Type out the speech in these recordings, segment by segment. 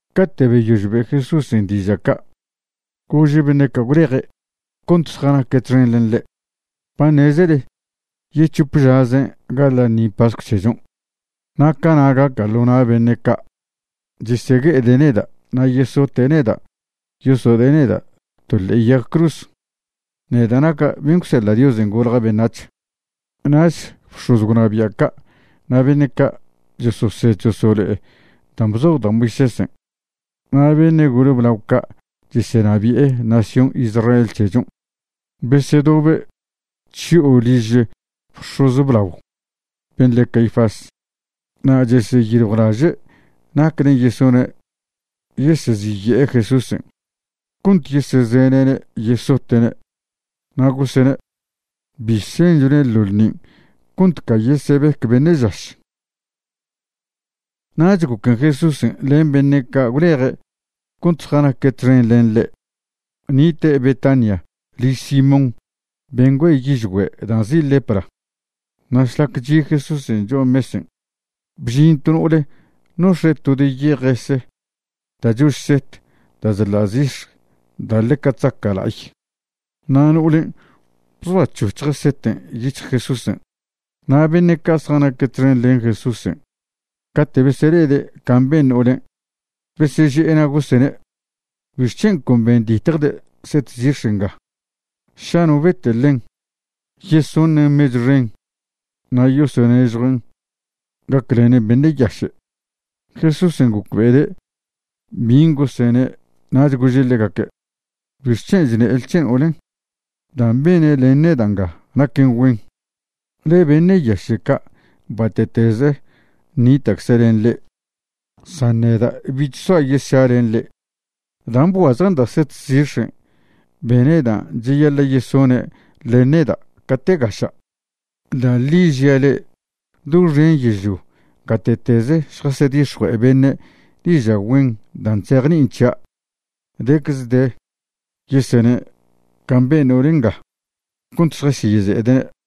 Cate' beyož be' Jesúsen' diža' ca', gože' beṉe' ca' gwleje' cont zjanaque' txen len ḻe': ―Ba ṉezele yec̱hope žazen' gaḻa' ḻṉi pascw c̱hechon'. Na' cana' gaca' ḻo na' beṉe' ca' chesegue'ede' neda' na' yesote' neda' yosode'e neda' to ḻe'e yag cruz, neda' naca' ben' gwseḻa' Diosen' golja' beṉac̱h. Nach bx̱oz gwnabia' ca' na' beṉe' ca' chososed chosolo'e dan' bzoj da' Moisésen' na' beṉe' gole blao ca' chesenabi'e nación Israel c̱hechon' besedobe' chyo'o liž bx̱oz blao ben' le Caifás. Na' cheseyiljwlaže' naclen' yesone' yeseziye'e Jesúsen' cont yesezene'ne' yesote'ne'. Na' gosene': ―Bi senchone' ḻo ḻṉin' cont ca yesebec beṉe' žaš. Nach goquen' Jesúsen' len beṉe' ca' gwleje' cont zjanaque' txen len ḻe' nite' Betania liž Simón ben' güe'e yižgüe' da' nzi' lepra. Na' šlac chi' Jesúsen' cho'a mesen', bžin to no'ole nox̱e' to de yejese ga chož set da' chḻa' zix̱ da' ḻeca chzaca' la'ay. Na' no'olen' bzoac̱hoc̱hje' seten' yic̱hj Jesúsen'. Na' beṉe' ca' zjanaque' txen len Jesúsen' cate' besele'ede' can' ben no'olen' beseže'e na' gosene': ―¿Bixc̱hen' con benditjde' set zix̱ nga? Ša no bete' ḻen, yesoṉen mechw xen na' yosonežjuen' gaclenen beṉe' yaše'. Jesúsen' gocbe'ede' bin' gosene' nach gože' ḻegaque': ―¿Bixc̱hen' chṉele c̱he no'olen'? Dan' bene' len neda' nga naquen güen. Ḻe beṉe' yaše' ca' bate'teze nita'cze' len le'e, san nedan' bich soa' yesša len le'e. Dan' bguazje'nda' set zix̱en' bene' dan' cheyaḻa' yesone' len neda' cate' gaša'. Da' ḻi žia' le'e, doxen yežlio gate'teze šjasedix̱jue'e beṉe' diža' güen dan' chzejni'in c̱hia', decze de yesene' can' ben no'ol nga, cont šjasyeze'ede'ne'.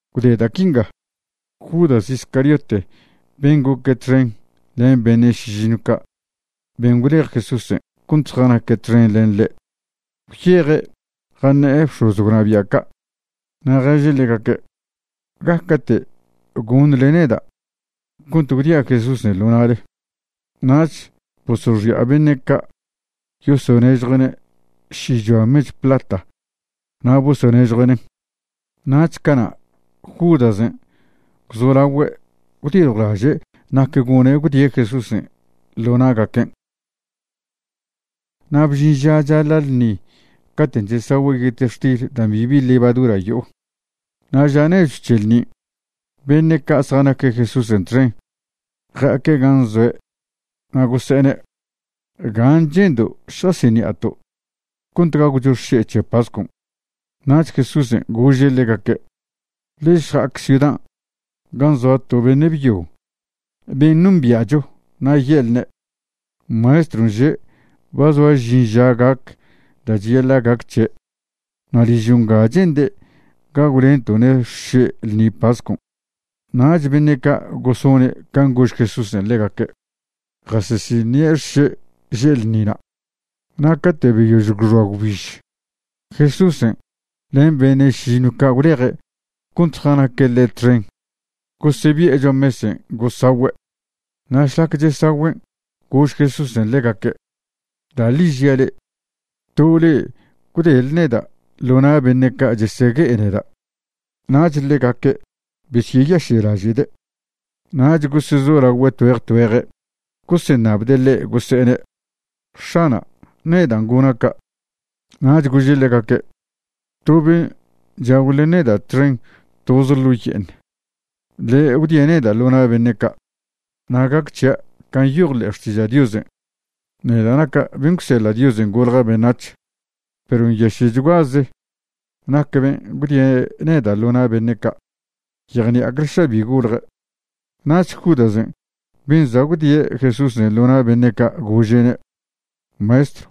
Gwde da' quinga, Judas Iscariote ben' goque' txen len beṉe' šižiṉw ca' ben' gwlej Jesúsen' cont zjanaque' txen len ḻe', gwyeje' jaṉe'e bx̱oz gwnabia' ca'. Na' ježe' ḻegaque': ―¿Gaca'te' goṉle neda' cont gwdia' Jesúsen' ḻo na'le? Nach bosoxi'a beṉe' ca' yosonežjue'ne' šichoa mechw plata na' bosonežjue'nen'. Nach cana' Judasen' gwzolagüe' gwdiljwlaže' nac gone' gwdie' Jesúsen' ḻo na'gaquen'. Na' bžin ža chaḻa' ḻṉi caten' chesagüe' yetextil dan' bibi levadura yo'o, na' ža nechw c̱he ḻṉin' beṉe' ca' zjanaque' Jesúsen' txen ja'aque' gan' zoe' na' gose'ene': ―¿Gan' che'ndo' šjasiṉi'ato' cont gagwcho xše' c̱he pascon'? Nach Jesúsen' gože' ḻegaque': ―Le'e šja'ac ciudan' gan' zoa to beṉe' byo ben' nombia'cho na' ye'lne': “Maestron' že' ba zoa žin ža gac da' cheyaḻa' gac c̱he', na' ližo' nga che'nde' gagwlento'ne' xše' ḻṉi pascon'.” Nach beṉe' ca' gosone' can' gož Jesúsen' ḻegaque', jasesiṉi'e xše' že' ḻṉina'. Na' cate' beyož gwxoa gwbiž, Jesúsen' len beṉe' šižiṉw ca' gwleje' cont zjanaque' ḻe' txen gosebi'e cho'a mesen' gosagüe'. Na' šlac chesagüen' gož Jesúsen' ḻegaque': ―Da' ḻi žia' le'e, to le'e gwdele neda' ḻo na' beṉe' ca' chesegue'e neda'. Nach ḻegaque' besyeyaše'laže'de', nach gosezolagüe' tgüeje tgüeje' goseṉabde' ḻe' gose'ene': ―X̱ana', ¿nedan' gona' ca'? Nach gože' ḻegaque': ―To ben' chagw len neda' txen toz ḻo' ye'eṉ, ḻe' gwdie' neda' ḻo na' beṉe' ca'. Na' gac c̱hia' can' nyoj ḻe'e Xtiža' Diosen', neda' naca' ben' gwseḻa' Diosen' golja' beṉac̱h, perw nyaše'chguaze nac ben' gwdie' neda' ḻo na' beṉe' ca'. Yejṉi'acle ša bi golje'. Nach Judasen' ben' za' gwdie' Jesúsen' ḻo na' beṉe' ca' gože'ne': ―Maestrw,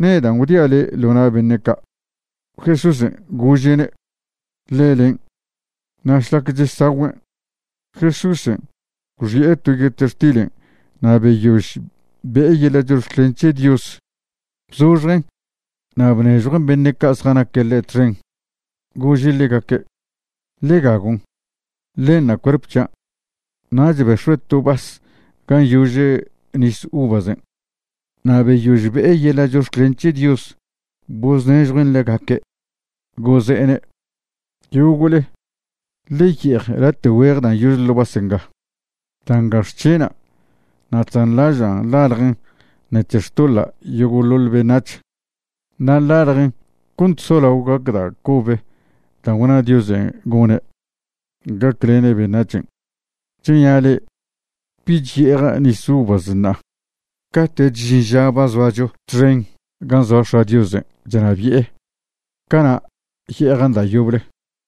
¿nedan' gwdia' le' ḻo na' beṉe' ca'? Jesúsen' gože'ne': ―Ḻe len'. Na' šlac chesagüen', Jesúsen' gwxi'e to yetextilen' na' beyož be'e yeḻa' chox̱clen c̱he Dios, bzoxjen' na' bnežjuen' beṉe' ca' zjanaque' ḻe' txen, gože' ḻegaque': ―Ḻe gagon'. Ḻenṉa' cuerp c̱hian'. Nach bex̱ue' to vas gan' yože nis uvasen', na' beyož be'e yeḻa' chox̱clen c̱he Dios boznežjuen' ḻegaque', goze'ene': ―Yogo'le, ḻe ye'ej late' güeje dan' yože ḻo' vas nga. Da' nga xc̱hena' na' chzanḻažan' ḻaljen ṉec̱he xtoḻa' yogo'ḻoḻ beṉac̱h. Na' ḻaljen cont solao gac da' cob dan' gwna Diosen' gone' gaclene' beṉac̱hen'. Chnia' le'e, bich ye'eja' nis uvas ṉa'a. Cate'ch žin ža ba zoacho txen gan' zoa X̱a' Diosen' chnabi'e, cana' ye'ejan' da' yoble.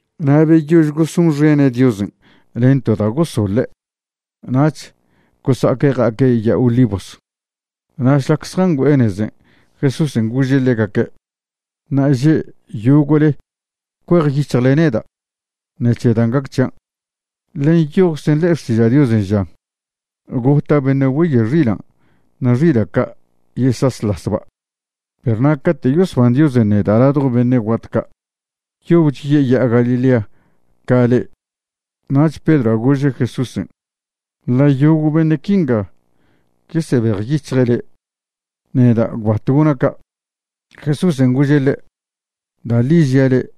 Na' beyož gosonxene' Diosen' len to da' gosoḻe', nach gosa'aque' ja'aque' Ya'a Olivos. Na' šlac zjangüe'e nezen' Jesúsen' gože' ḻegaque': ―Ṉa'aže' yogo'le cuejyic̱hjle neda' ṉec̱he dan' gac c̱hian'. Ḻe nyojczen ḻe'e Xtiža' Diosen' žan: “Gota' beṉe' güeye' xilan' na' xila' ca' yesaslasba'.” Perw na' cate' yosban Diosen' neda' ladjo beṉe' guat ca', yobch yeya'a Galilea ca le'e. Nach Pedroa' gože' Jesúsen': ―Ḻa' yogo' beṉe' quinga yesebejyic̱hje' le', neda' gwbat gona' ca'. Jesúsen' gože' ḻe': ―Da' ḻi žia' le',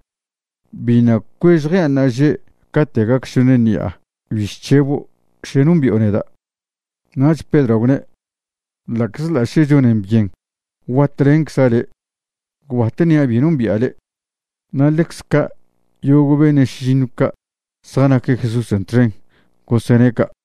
biṉa' cuež jean' ṉa'aže' cate' gac šoṉ ṉi'a bi chc̱hebo' še nombi'o neda'. Nach Pedroa' gwne': ―Ḻa'czḻa' še chonen byen guatlencza' le', gwbat ṉia' bi nombi'a le'. Na' ḻecze ca' yogo' beṉe' šižiṉw ca' zjanaque' Jesúsen' txen gosene' ca'.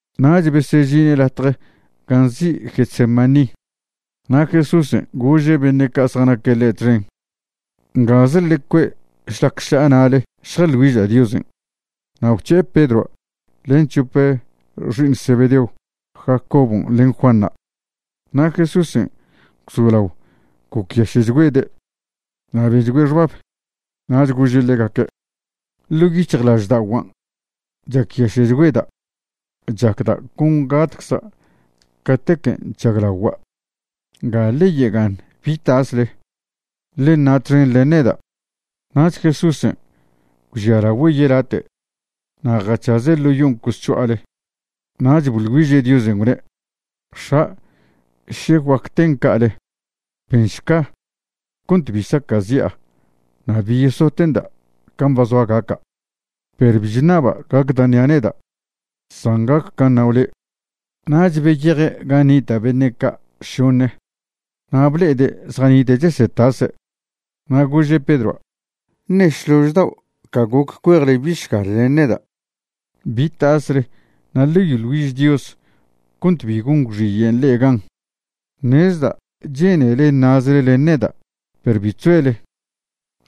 Nach besežine' latje gan' nzi' Getsemaní, na' Jesúsen' gože' beṉe' ca' zjanaque' ḻe' txen: ―Ngaze ḻe cue' šlac ša'a na'le šjaḻ güiža' Diosen'. Na' gwc̱he'e Pedroa' len c̱hop xi'iṉ Zebedeo, Jacobon' len Juanṉa'. Na' Jesúsen' gwzolao gocyaše'chgüede', na' benchgüe' xbab. Nach gože' ḻegaque': ―Ḻo' yic̱hjlažda'oguan' chacyaše'chgüeda', chacda' con gatcza' catequen' chžaglagua'. Nga ḻe yega'aṉ bi tasle, ḻe ṉa' txen len neda'. Nach Jesúsen' gwžialagüe' yelate' na' jac̱haze' ḻo yon' cosc̱ho'ale nach boḻ güiže' Diosen', gwne': ―X̱a', še guac ten ca'ale, benšca cont bi saca'zi'a na' bi yesote'nda' can' ba zoa gaca'. Perw bi chṉaba' gac da' ṉia' neda', san gac can' ṉao' le'. Nach beyeje' gan' nita' beṉe' ca' šoṉe na' ble'ede' zjanite' chesetase'. Na' gože' Pedroa': ―¿Ṉe šlož dao' ca goc cuejle bišgal len neda'? Bi tasle na' ḻe yoḻ güiž Dios cont bi gon gwxiyen' le'e gan'. Ṉezda' che'nele ṉa'zle len neda' perw bi chzoele.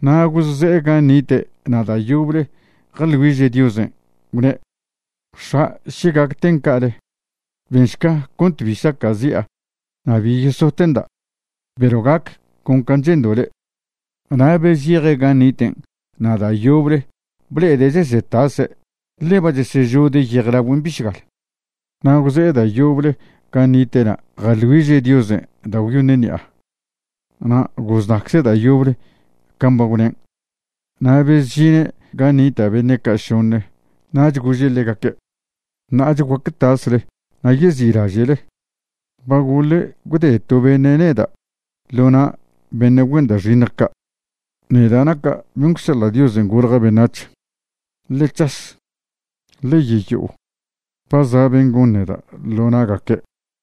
Na' gosze'e gan' nite' na' da' yoble jaḻ güiže' Diosen', gwne': ―X̱a', še gac ten ca'ale, benšca cont bi saca'zi'a na' bi yesote'nda', perw gac con can' che'ndo' le'. Na' bezyeje' gan' niten' na' da' yoble ble'ede' chesetase' ḻe ba chesežode' yejlagüen' bišgal. Na' gwze'e da' yoble gan' nite'na' jaḻ güiže' Diosen' da' gwyoṉe ṉi'a, na' goznacze' da' yoble can' ba gwnen'. Na' bezžine' gan' nita' beṉe' ca' šoṉe nach gože' ḻegaque': ―Ṉa'ach guaque tasle na' yezi'laže'le. Ba gole gwde to beṉe' neda' ḻo na' beṉe' güen da' xiṉj ca', neda' naca' ben' gwseḻa' Diosen' golja' beṉac̱h. Ḻe c̱has. Ḻe yeyo'o. Ba za' ben' gon neda' ḻo na'gaque'.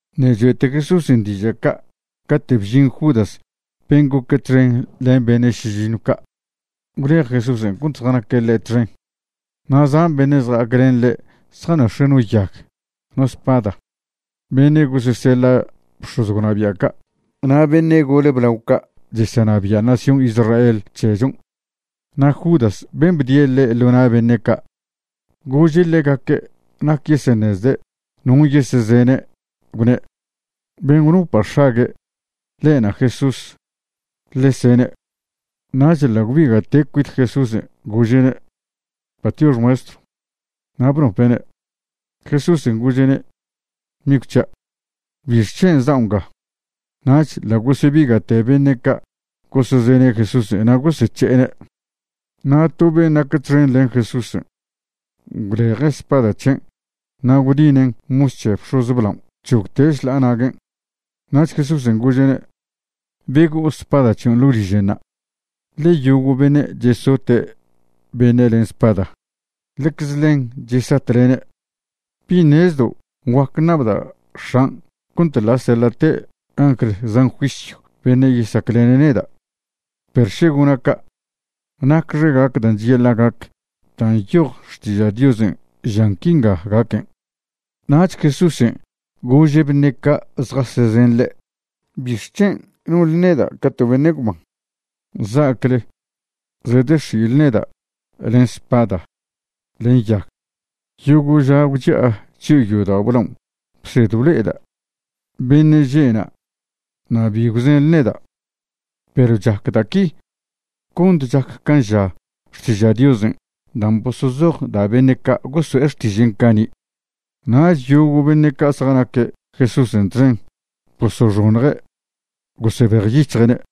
Ṉe' choe'te Jesúsen' dižan' ca' cate' bžin Judas ben' goque' txen len beṉe' šižiṉw ca' gwlej Jesúsen' cont zjanaque' ḻe' txen. Na' zan beṉe' zja'ac len ḻe' zjanox̱e' no yag, no spada, beṉe' goseseḻa' bx̱oz gwnabia' ca' na' beṉe' gole blao ca' chesenabi'e nación Israel c̱hechon'. Na' Judas ben' bdie' ḻe' ḻo na' beṉe' ca', gože' ḻegaque' nac yeseṉezde' non' yesezene', gwne': ―Ben' gwnopa' x̱ague', ḻe'na' Jesús. Ḻe sene'. Nach ḻa' gwbiga'te' cuit Jesúsen', gože'ne': ―Patiox, Maestrw. Na' bnope'ne'. Jesúsen' gože'ne': ―Migw c̱hia', ¿bixc̱hen' zao' nga? Nach ḻa' gosebiga'te beṉe' ca' gosezene' Jesúsen' na' gosec̱he'ene'. Na' to ben' nac txen len Jesúsen' gwleje' spada c̱hen' na' gwdinen' mos c̱he bx̱oz blaon' gwc̱hogte' šḻa'a naguen'. Nach Jesúsen' gože'ne': ―Bego'o spada c̱hion' ḻo' liženṉa', ḻe yogo' beṉe' chesote' beṉe' len spada, ḻecze ḻen chesatlene'. ¿Bi ṉezdo' guac ṉabda' X̱an' cont ḻa' seḻa'te' angl zan juisyw beṉe' yesaclene' neda'? Perw še gona' ca' ¿nacxe gac dan' cheyaḻa' gac dan' nyoj Xtiža' Diosen' žan quinga gaquen'? Nach Jesúsen' gože' beṉe' ca' zjasezen ḻe': ―¿Bixc̱hen' nonḻe neda' ca to beṉe' gwban za'acle zedex̱i'le neda' len spada len yag? Yogo' ža gwchi'a chyo'o yodao' blaon' bsed blo'eda' beṉe' že'na' na' bi gwzenḻe neda'. Perw chac da' qui cont chac can' ža Xtiža' Diosen' dan' bosozoj da' beṉe' goso'e xtižen' cani'. Nach yogo' beṉe' ca' zjanaque' Jesúsen' txen bosoxoṉje' gosebejyic̱hje'ne'.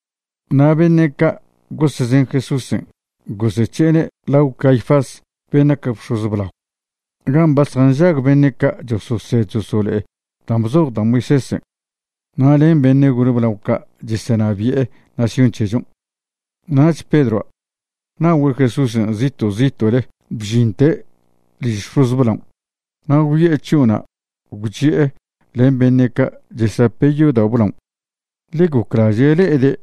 Na' beṉe' ca' gosezen Jesúsen' gosec̱he'ene' lao Caifás ben' nac bx̱oz blao, gan' ba zjanžag beṉe' ca' chososed chosolo'e dan' bzoj da' Moisésen' na' len beṉe' gole blao ca' chesenabi'e nación c̱hechon'. Nach Pedroa' na'ogüe' Jesúsen' zito' zito'le bžinte' liž bx̱oz blaon', na' gwyo'e chyo'ona' gwchi'e len beṉe' ca' chesape' yodao' blaon', ḻe goclaže' le'ede'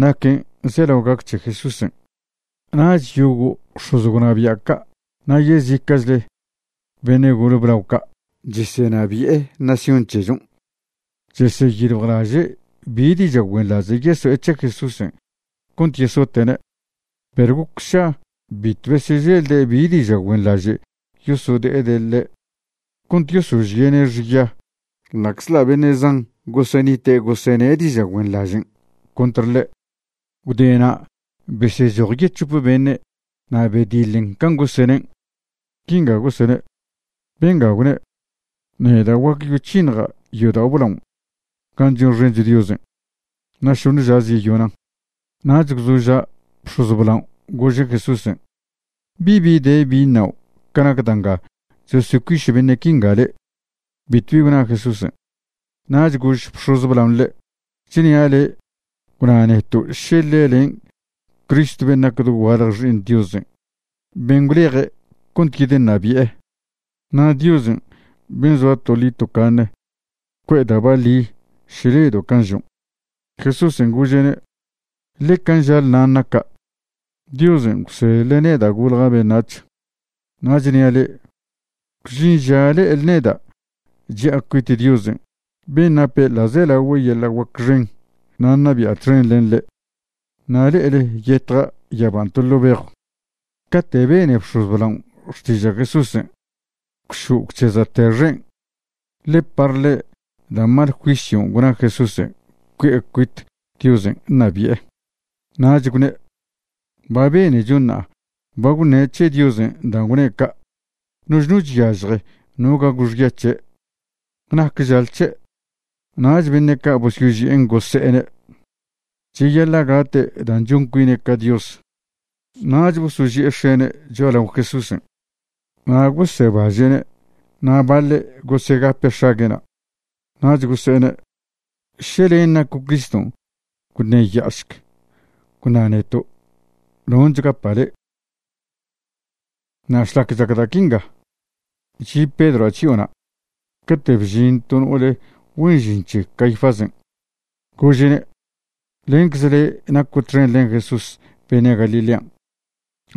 naquen' zelao gac c̱he Jesúsen'. Nach yogo' bx̱oz gwnabia' ca' na' yezica'chle beṉe' gole blao ca' chesenabi'e nación c̱hechon' cheseyiljwlaže' bi diža' güenḻaže' yeso'e c̱he Jesúsen' cont yesote'ne'. Perw goc sša bitw besyeželde' bi diža' güenḻaže' yosode'ede' ḻe' cont gosožie'ne' xya ḻa'czḻa' beṉe' zan gosenite' gosene' diža' güenḻažen' contr ḻe'. Gwde na' besechoj yec̱hope beṉe' na' bediḻen can' gosenen'. Quinga gosene': ―Benga gwne': “Neda' guac yoc̱hiṉja' yodao' blao gan' chonxencho Diosen', na' šoṉe žaze yeyonan'.” Nach gwzoža' bx̱oz blaon' gože' Jesúsen': ―¿Bibi de bi ṉao' ca nac da' nga chosocuiš beṉe' quinga le'? Bitwbi gwna Jesúsen'. Nach gož bx̱oz blaon' ḻe': ―Chnia' le' gwna neto' še ḻe len' Cristo ben' nac dogualje Xi'iṉ Diosen', ben' gwleje' cont yedeṉabi'e. Na' Diosen' ben' zoa toḻi tocaṉe cue'e da' baḻi še ledo' can' žon'. Jesúsen' gože'ne': ―Ḻe can' žale nan' naca'. Diosen' gwseḻe' neda' golja' beṉac̱h. Na' chnia' le'e, gwžin ža le'ele neda' chi'a cuit Diosen' ben' nape ḻa'zelagüe yeḻa' guac xen, na' ṉabi'a txen len ḻe', na' le'ele yetja' yaban' to ḻo' bejw. Cate' bene bx̱oz blaon' xtiža' Jesúsen', gwšo' gwc̱heza'te xen', ḻe par ḻe' da' mal juisyon' gwna Jesúsen' cui'e cuit Diosen' ṉabi'e. Nach gwne': ―Ba benecho ṉa'a ba gwṉe' c̱he Diosen' dan' gwne' ca'. Noch no chyažje no gagw xya c̱he'. ¿Nac žale c̱he'? Nach beṉe' ca' bosyoži'en gose'ene': ―Cheyaḻa' gate' dan' chon cuine' ca Dios. Nach bosoži'e x̱ene' cho'alao Jesúsen', na' gosebaže'ne', na' baḻe' gosegape' x̱ague'na'. Nach gose'ene': ―Še len' naco' Criston', gwṉeya'ašc, gwna neto', ¿non' chgapa' le'? Na' šlac chac da' quinga, chi' Pedroa' chyo'ona', cate' bžin to no'ole güen žin c̱he Caifásen', gože'ne': ―Lencze le' naco' txen len Jesús beṉe' Galilean'.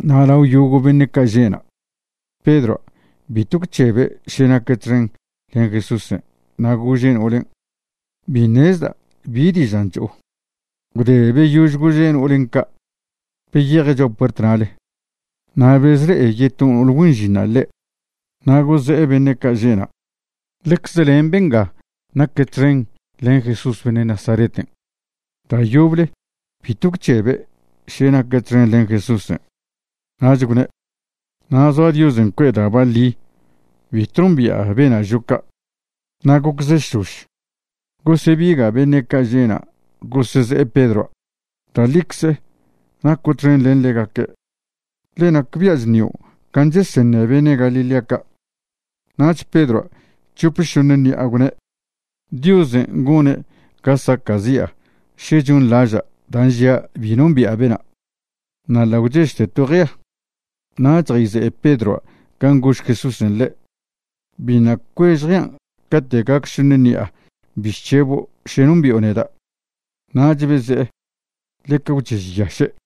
Na' lao yogo' beṉe' ca' že' na', Pedroa' bitw gwc̱hebe' še naque' txen len Jesúsen', na' gože' no'olen': ―Bi ṉezda' bi dižan' cho'o. Gwde beyož gože' no'olen' ca' beyeje' cho'a puert na'le, na' bezle'e yeto no'ole güen žinṉa' ḻe', na' goze'e beṉe' ca' že'na': ―Ḻecze len benga naque' txen len Jesús beṉe' Nazareten'. Da' yoble bitw gwc̱hebe' še naque' txen len Jesúsen', nach gwne': ―Na' zoa Diosen' cue'e da' baḻi bitw nombi'a bena' žo' ca'. Na' goccze šlož, gosebiga' beṉe' ca' že'na' goseze'e Pedroa': ―Da' ḻicze, naco' txen len ḻegaque', ḻe nacbia' chṉio' can' cheseṉe beṉe' Galilea ca'. Nach Pedroa' c̱hop šoṉe ṉi'a gwne': ―Diosen' goṉe' ga saca'zi'a še chonḻaža' dan' žia' bi nombi'a bena'. Na' ḻa' gwchežte to jea. Nach jayze'e Pedroa' can' gož Jesúsen' ḻe': “Biṉa' cuež jean' cate' gac šoṉe ṉi'a bi chc̱hebo' še nombi'o neda'.” Nach beze'e ḻeca gwchežyaše'.